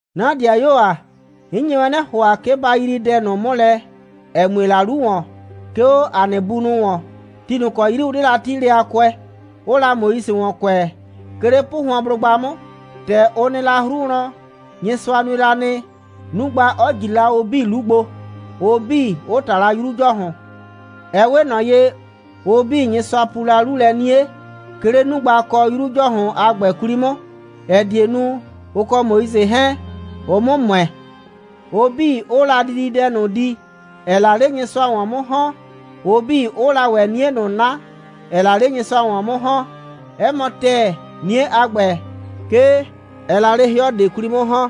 'Na ‑dɩayuo ‑a, 'n nye wɛn 'nɩ ‑hʋa, 'ke ba yrii dɛ ꞊nʋ 'mʋ lɛ, ‑ɛ mue la 'lu ‑wɔn, 'ke 'o ‑a nɩ bunʋ ‑wɔn, ti ꞊nʋ ‑kɔ 'yri ʋ 'de la 'tiilɛ a kʋɛ, ʋʋ la Moise ‑wɔn kʋɛ, 'ke 'le 'pʋhʋɔnblʋgba 'mʋ. ‑Tɛ ʋ nɩ la 'hru wlɔn, Nyɩsʋa nue la nɩ, 'nugba 'ɔ ꞊jri la ʋ 'bii 'lu gbo, ʋ 'bii 'ʋ ꞊ta la 'Yru ‑Jɔhʋn. Ɛ 'we ꞊nɔ ye, ʋ 'bii, Nyɩsʋa pu la 'lu lɛ 'nie, 'ke 'le 'nugba kɔ 'Yru ‑Jɔhʋn a ‑gbɛ 'kwli 'mʋ, ‑ɛ die nu, ʋ kɔ Moise 'hɛɛn, ʋ 'mʋ ‑mʋɛ; ʋ 'bii, 'ʋʋ la dididɛ ꞊nʋ di, ‑ɛɛ la 'le Nyɩsʋa ‑wɔn 'mʋ ‑hɔn, ʋ 'bii, 'ʋʋ la ‑wɛ 'nie ꞊nʋ 'na, ‑ɛɛ la 'le Nyɩsʋa ‑wɔn 'mʋ ‑hɔn. 'Ɛ mɔ ‑tɛɛ, 'nie a ‑gbɛ, 'ke ɛɛ la 'le 'hɩɔ ꞊de 'kwli 'mʋ ‑hɔn.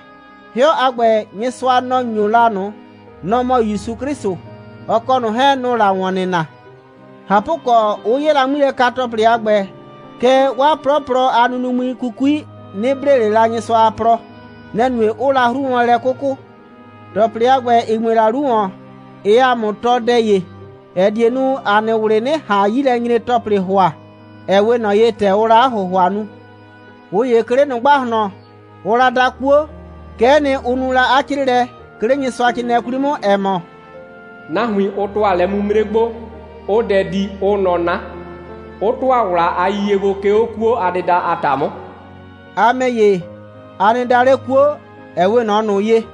'Hɩɔ a ‑gbɛ, Nyɩsʋa, nɔ‑ ‑nyo la ꞊nʋ. Nɔ‑ mɔ ‑Yusu 'Klɩsʋ. Ɔ kɔ ꞊nʋ 'hɛɛn, nʋ‑ʋ la ‑wɔn nɩna. ꞊Hapʋkɔ, 'ʋ 'ye la 'ŋmilɛka‑tɔplɩ a ‑gbɛ, kɛɛ, 'waa 'plɔplɔ a nunuŋmli 'kukui 'nɩ blee ꞊le la Nyɩsʋa a plɔ. Nɛ‑ nue, 'ʋʋ la 'hru wlɔn lɛ 'kʋkʋ. ‑Tɔplɩ a ‑gbɛ, ‑ɩ mue la 'lu ‑wɔn, ɩɩ ‑a mʋ tɔɔ dɛ ‑ye, ‑ɛ die nu, ‑a nɩ ꞊wlɩ 'nɩ ꞊han 'yilɛnyre‑tɔplɩ ‑hʋa, ‑ɛ 'we ꞊nɔ ye, ‑tɛ ʋʋ la 'a ‑hʋhʋa nu. ꞊Ʋ ‑ye 'ke 'le ꞊nʋ ‑gbahlɔn, ʋʋ la da 'kuo. Kɛ'ɛ nɩ, ʋ nu la 'a 'crɩɩlɛ, 'ke 'le Nyɩsʋacrɩɩnɩɛ 'kwli 'mʋ, ‑ɛ mɔ: «Nahuin, ʋ ‑tʋa lɛ'mimre gbo, 'ʋʋ dɛ di, 'ʋʋ nɔ 'na, 'ʋ ‑tʋa ‑wla a yiyie gbo, 'ke 'o 'kuo a dɩda a ‑ta 'mʋ.» A ‑mɛ ‑ye, a nɩ da 'le 'kuo, ‑ɛ 'we ꞊nɔ ꞊nʋ ye.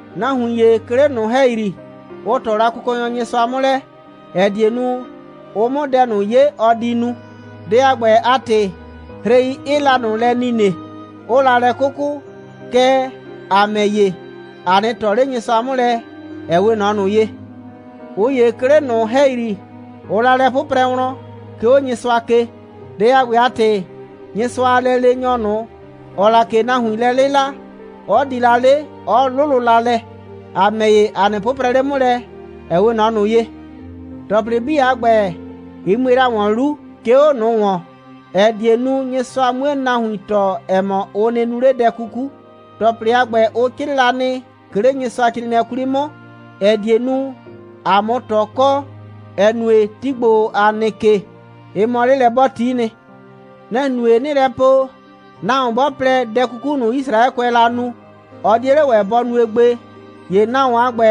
Nahuin ‑ye, 'ke 'le ꞊nʋ ‑hɛyri, ʋ ꞊tɔ la Kʋkɔnyɔ Nyɩsʋa 'mʋ lɛ, ‑ɛ die nu, ʋ 'mʋ dɛ ꞊nʋ 'ye, ɔ di nu. Dɛ a ‑gbɛ a ‑tɩ, hrei 'ɩɩ la ꞊nʋ lɛ nine, 'ʋʋ la lɛ 'kʋkʋ. Kɛɛ, ‑a ‑mɛ ‑ye, ‑a 'nɩ ꞊tɔ 'le Nyɩsʋa 'mʋ lɛ, ‑ɛ 'we ꞊nɔ ꞊nʋ ye. ꞊Ʋ ‑ye 'ke 'le ꞊nʋ ‑hɛyri, ʋʋ la 'mʋ lɛ 'pʋprɛ wlɔn, 'ke 'o Nyɩsʋa ke. Dɛ a ‑gbɛ a ‑tɩ, Nyɩsʋa a lɛleenyɔ ꞊nʋ, ‑ɔɔ la ꞊ke nahuin lɛ 'lɩla, 'ɔ di la 'le, 'ɔ 'lʋlʋ la lɛ. A ‑mɛ ‑ye, a nɩ 'pʋprɛ 'le 'mʋ lɛ, ‑ɛ 'we ꞊nɔ ꞊nʋ ye. ‑Tɔplɩ 'bii a ‑gbɛ, ɩ mue la ‑wɔn 'lu, 'ke 'o ꞊nʋ ‑wɔn, ‑ɛ die nu, Nyɩsʋa 'mue nahuin tɔɔ, ‑ɛ mɔ, ʋ nɩ nu 'le dɛ 'kuku. ‑Tɔplɩ a ‑gbɛ, ʋ 'crɩɩ la nɩ, 'ke 'le Nyɩsʋacrɩɩnɩɛ 'kwli 'mʋ, ‑ɛ die nu, ‑a 'mʋ ꞊tɔ kɔ, ‑ɛ nue, ti ‑gbo, ‑a nɩ ke, ɩ mɔ 'lelɛ'bɔɔti'i nɩ. Nɛ‑ nue, 'nɩɩ lɛ po, nahuon 'bɔ plɛ, dɛ 'kuku ꞊nʋ, Yisraɛkʋɛɛ la nu, ɔ 'die 'le ‑wɛ bɔ nue gbe, ‑ye nahuon a ‑gbɛ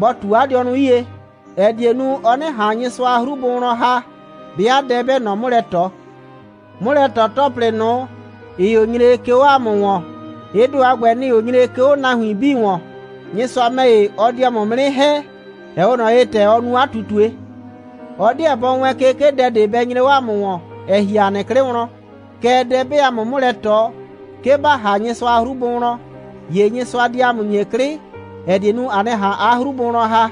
bɔ ꞊tu 'a dɩɔnʋ 'yie, ‑ɛ die nu, ɔ 'nɩ ꞊han Nyɩsʋa a 'hru bʋ wlɔn ‑ha, 'bɩa dɛ 'bɛɛ ꞊nɔ 'mʋ lɛ ꞊tɔ. 'Mʋlɛ꞊tɔ‑tɔplɩ ꞊nʋ, ‑ɩɩ 'o nyre, 'ke 'o 'a mʋ ‑wɔn, ɩ ‑do a ‑gbɛ, nɩ‑ɩ 'o nyre, 'ke 'o nahuin 'bii ‑wɔn. Nyɩsʋa ‑mɛ ‑ye, ɔ di 'a mʋ 'mʋ 'nɩ ‑hɛ, ‑ɛ 'we ꞊nɔ ye, ‑tɛ ɔ nu 'a ꞊tutue. Ɔ 'deɛ bɔ wɛɛn ke, 'ke dɛ ꞊de bɛ nyre 'o 'a mʋ ‑wɔn, ‑ɛ ‑hi 'a nɩ 'klɩ wlɔn. Kɛɛ, dɛ 'bɛɛ 'a mʋ 'mʋ lɛ ꞊tɔ, 'ke ba ‑ha Nyɩsʋa a 'hru bʋ wlɔn, ‑ye Nyɩsʋa di 'a mʋ ‑nyi 'klɩ, ‑ɛ die nu, a 'nɩ ꞊han 'a 'hru bʋ wlɔn ‑ha.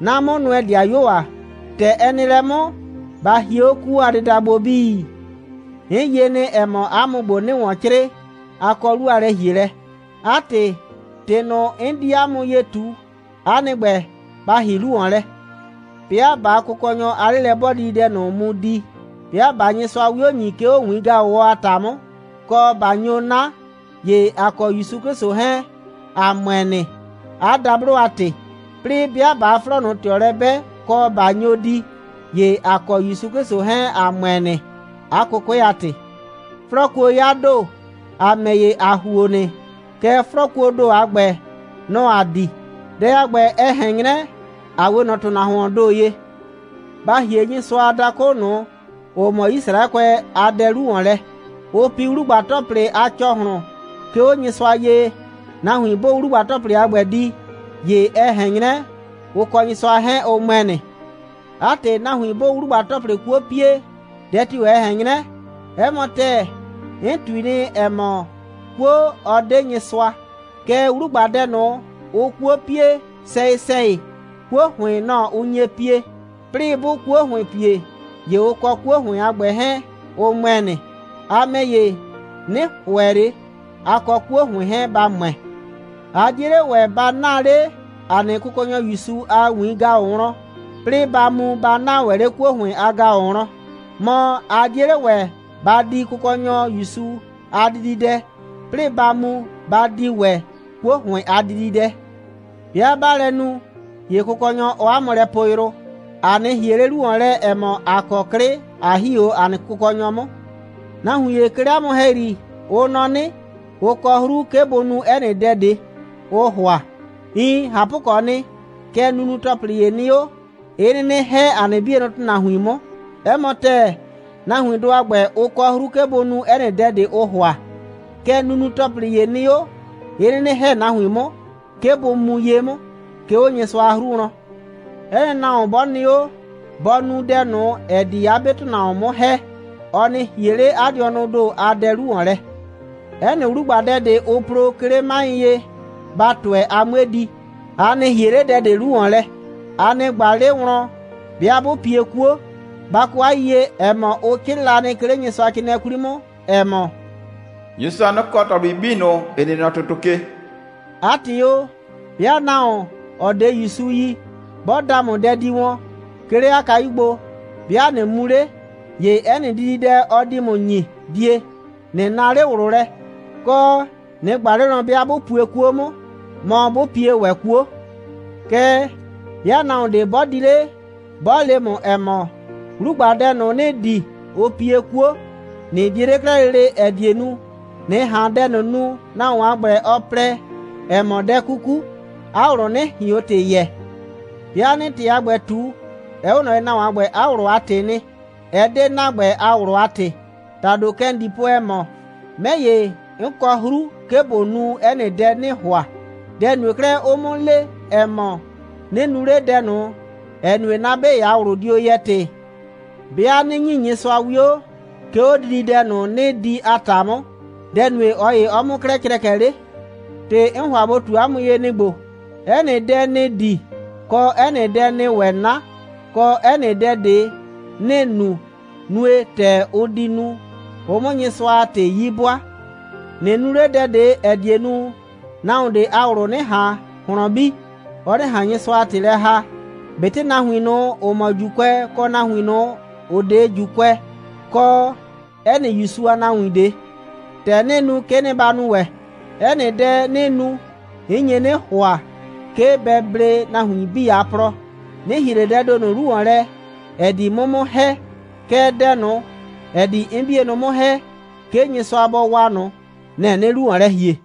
'Na 'mʋnʋɛ‑dɩayuo ‑a, ‑tɛ ɛ nɩ lɛ 'mʋ, ba hie 'o 'kuo a dɩda gbo 'bii. 'N yie nɩ, ‑ɛ mɔ, 'a mʋ ‑gbo, 'nɩɩ ‑wɔn 'crɩɩ, a kɔ 'lu a lɛ‑hielɛ. 'A ‑tɩ, ‑tɩ ꞊nʋ, 'n di 'a mʋ ye ꞊tu, 'a nɩ ‑gbɛ, ba ‑hii 'lu ‑wɔn lɛ. 'Bɩa ꞊baa Kʋkɔnyɔ a 'lelɛ'bɔɔdididɛ ꞊nʋ mu di, 'bɩa ꞊baa Nyɩsʋa 'wio ‑nyi, 'ke 'o ‑wiin‑gaʋwɔ a ‑ta 'mʋ, kɔ, ꞊ba nyo 'na, ‑ye ‑a kɔ ‑Yusu 'Klɩsʋ 'hɛɛn, ‑a ‑mʋɛ nɩ, 'a dablo a ‑tɩ. 'Plɩɩ 'bɩa ꞊baa 'flɔɔ ꞊nʋ ꞊tɩɔ lɛ 'bɛ, kɔ, ꞊ba nyo di, ‑ye ‑a kɔ ‑Yusu 'Klɩsʋ 'hɛɛn, ‑a ‑mʋɛ nɩ, 'a 'kʋkʋɛ a ‑tɩ. 'Flɔɔkuo 'ya ‑do. ‑A ‑mɛ ‑ye, ‑a ‑huo nɩ, kɛɛ, 'flɔɔkuoo ‑do a ‑gbɛ, nɔ‑ ‑aa di. Dɛ a ‑gbɛ, ɛ ꞊hɛn 'nyrɛ, ‑a 'we ꞊nɔ ‑tʋnahuoon ‑do ye. Ba ‑hie Nyɩsʋa a dakʋ ꞊nʋ, ‑ʋ mɔ Yisraɛkʋɛ a dɛ 'lu ‑wɔn lɛ. Ʋʋ pi 'wlugba‑tɔplɩ a ‑cɔhlʋn, 'ke 'o Nyɩsʋa ye. Nahuin 'bʋʋ 'wlugba‑tɔplɩ a ‑gbɛ di, ‑ye ɛ ꞊hɛn 'nyrɛ, ʋ kɔ Nyɩsʋa 'hɛɛn, ʋ ‑mʋɛ nɩ. 'A ‑tɩ, nahuin 'bʋʋ 'wlugba‑tɔplɩ 'kuo pie, dɛ tio‑ ɛ ꞊hɛn 'nyrɛ? 'Ɛ mɔ ‑tɛɛ, 'n ꞊tui nɩ, ‑ɛ mɔ, 'kuo, ɔ 'de Nyɩsʋa. Kɛɛ, 'wlugbadɛ ꞊nʋ, ʋʋ 'kuo pie, sɛyɩ‑sɛyɩ 'kuo ‑hʋɩn, nɔ‑ ʋ nye pie. 'Plɩɩ 'bʋʋ 'kuo ‑hʋɩn pie, ‑ye ʋ kɔ 'kuo ‑hʋɩn a ‑gbɛ 'hɛɛn, ʋ ‑mʋɛ nɩ. A ‑mɛ ‑ye, 'nɩ ‑hʋɛ ꞊le, a kɔ 'kuo ‑hʋɩn 'hɛɛn, ba ‑mʋɛ. A 'die 'le ‑wɛ ba 'naa 'le ‑a nɩ Kʋkɔnyɔ ‑Yusu a ‑wiin‑gaʋ wlɔn, 'plɩɩ ba mu, ba 'naa ‑wɛ 'le 'kuo ‑hʋɩn a ‑gaʋ wlɔn. Mɔ, a 'die 'le ‑wɛ, ba di Kʋkɔnyɔ ‑Yusu a dididɛ, 'plɩɩ ba mu, ba di ‑wɛ 'kuo ‑hʋɩn a dididɛ. 'Bɩa ꞊baa lɛ nu, ‑ye Kʋkɔnyɔ, ɔɔ ‑a mʋ lɛ poo yrʋ. ‑A 'nɩ ‑hie 'le 'lu ‑wɔn lɛ, ‑ɛ mɔ, ‑a kɔ 'klɩ, ꞊a ‑hi 'o ‑a nɩ Kʋkɔnyɔ 'mʋ. Nahuin ‑ye 'ke 'le 'a mʋ ‑hɛyri, ʋ nɔ 'nɩ, ʋ kɔ 'hru, 'ke bʋ nu 'ɛ nɩ dɛ ꞊de, ʋʋ ‑hʋa. Iin, ꞊hapʋkɔɔ nɩ, kɛɛ, nunu‑tɔplɩ ‑ye nɩ 'o, 'ɩ 'nɩnɩ ‑hɛ ‑a nɩ 'bienʋ ‑tʋnahuin 'mʋ. 'Ɛ mɔ ‑tɛɛ, nahuindʋ a ‑gbɛ, ʋ kɔ 'hru, 'ke bʋ nu 'ɛ nɩ dɛ ꞊de, ʋʋ ‑hʋa. Kɛɛ, nunu‑tɔplɩ ‑ye nɩ 'o, 'ɩ 'nɩnɩ ‑hɛ nahuin 'mʋ, 'ke bʋ mu ye 'mʋ, 'ke 'o Nyɩsʋa a 'hru wlɔn. 'Ɛ nɩ nahuon 'bɔ nɩ 'o, bɔ nu dɛ ꞊nʋ, ‑ɛ di 'a 'be ‑tʋnahuon 'mʋ ‑hɛ. Ɔ nɩ ‑hie 'le 'a dɩɔnʋʋ ‑do a dɛ 'lu ‑wɔn lɛ. 'Ɛ nɩ 'wlugbadɛ ꞊de, ʋʋ plo, 'ke 'le 'maɩ ye, ba ‑tʋɛ, a 'mue di. A nɩ ‑hie 'le dɛ ꞊de 'lu ‑wɔn lɛ. A nɩ ꞊gba 'le wlɔn, 'bɩa 'bʋ pie 'kuo. Ba kɔ 'a yiyie, ‑ɛ mɔ, ʋ 'crɩɩ la nɩ, 'ke 'le Nyɩsʋacrɩɩnɩɛɛ 'kwli 'mʋ, ‑ɛ mɔ: «Nyɩsʋa, nɔ‑ kɔ ‑tɔplɩ 'bii ꞊nʋ, ‑ɩ nɩ nɔ ‑tʋtʋ ke.» 'A ‑tɩ o, 'bɩa nahuon, ‑ɔ 'de ‑Yusu yi, 'bɔ da ‑mʋ dɛ di wɔn, 'ke 'le 'a kayu gbo, 'bɩa ꞊nɩ mu 'le, ‑ye 'ɛ nɩ dididɛ, ɔ di ‑mʋ ‑nyi, die, ꞊nɩ naa 'le ꞊wlʋ lɛ, kɔ, ꞊nɩ ꞊gba 'le wlɔn, 'bɩa 'bʋ pue 'kuo 'mʋ, mɔ, 'bʋ pie ‑wɛ 'kuo. Kɛɛ, 'bɩa nahuon ꞊de 'bɔ di 'le, 'bɔ le ‑mʋ, ‑ɛ mɔ: «'Wlugbadɛ ꞊nʋ, ‑nɩɩ di, ʋ pie 'kuo,» ꞊nɩ die 'le 'klɛɛ lele, ‑ɛ die nu, ꞊nɩ ꞊han dɛ ꞊nʋ nu, nahuon a ‑gbɛ, ɔ plɛ, ɛ mɔ dɛ 'kuku, 'a ꞊wlʋ 'nɩ ꞊hion ‑tɩ yɛɛ. 'Bɩa 'nɩɩ ‑tɩ a ‑gbɛ ꞊tu, ɛ 'we ꞊nɔ ye, nahuon a ‑gbɛ a ꞊wlʋ a ‑tɩɩ nɩ, ɛ 'de ‑na ‑gbɛ a ꞊wlʋ a ‑tɩ. ‑Tado, kɛ ‑n di po, ‑ɛ mɔ: «'Mɛ ‑ye, 'n kɔ 'hru, 'ke ꞊bo nu 'ɛ nɩ dɛ, 'nɩɩ ‑hʋa. Dɛ‑ nue 'klɛɛ, 'ʋʋ 'mʋ le, ‑ɛ mɔ, 'nɩ nu 'le dɛ ꞊nʋ, ‑ɛ nue, 'na 'be ‑ye a ꞊wlʋ dio yɛɛ ‑tɩ. 'Bɩa 'nɩ ‑nyi Nyɩsʋa 'wio, 'ke 'o dididɛ ꞊nʋ, 'nɩɩ di a ‑ta 'mʋ, dɛ‑ nue, ꞊ɔ ‑ye 'ɔɔ 'mʋ 'klɛɛ crɛkɛ 'le?» ‑Tɩ 'n ‑hʋa ꞊bo ꞊tu ‑mʋ ye, nɩ‑ ‑gbo: 'Ɛ nɩ dɛ, ‑nɩɩ di, kɔ, 'ɛ nɩ dɛ, ‑nɩɩ ‑wɛ 'na, kɔ, 'ɛ nɩ dɛ ꞊de, ‑nɩɩ nu, nue, ‑tɛ ʋ di nu, ʋ 'mʋ Nyɩsʋa a ‑tɩ 'yi 'bʋaa. ꞊Nɩ nu 'le dɛ ꞊de, ‑ɛ die nu, nahuon ꞊de a ꞊wlʋ 'nɩ ꞊han ꞊hlɔn bi, ɔ 'nɩ ꞊han Nyɩsʋa a ‑tɩ lɛ ‑haa, ꞊betɩ nahuin ꞊nʋ, ‑ʋ mɔ ‑Juukʋɛ, kɔ nahuin ꞊nʋ, ‑ʋ 'de ‑Juukʋɛ, kɔ 'ɛ nɩ ‑Yusu a nahuin ꞊de. ‑Tɛ 'nɩɩ nu, kɛ'ɛ nɩ, ba nu ‑wɛ. 'Ɛ nɩ dɛ, 'nɩɩ nu, 'n nye 'nɩ ‑hʋa, 'ke bɛ blee nahuin 'bii a plɔ. 'Nɩ ‑hie ꞊le dɛɛ ‑do ꞊nʋ 'lu ‑wɔn lɛ, ‑ɛ di 'mʋ 'mʋ ‑hɛ, kɛɛ, dɛ ꞊nʋ, ‑ɛ di 'n 'bienʋ 'mʋ ‑hɛ, 'ke Nyɩsʋa bɔ waa ꞊nʋ, nɛ‑ 'nɩɩ 'lu ‑wɔn lɛ ‑hie.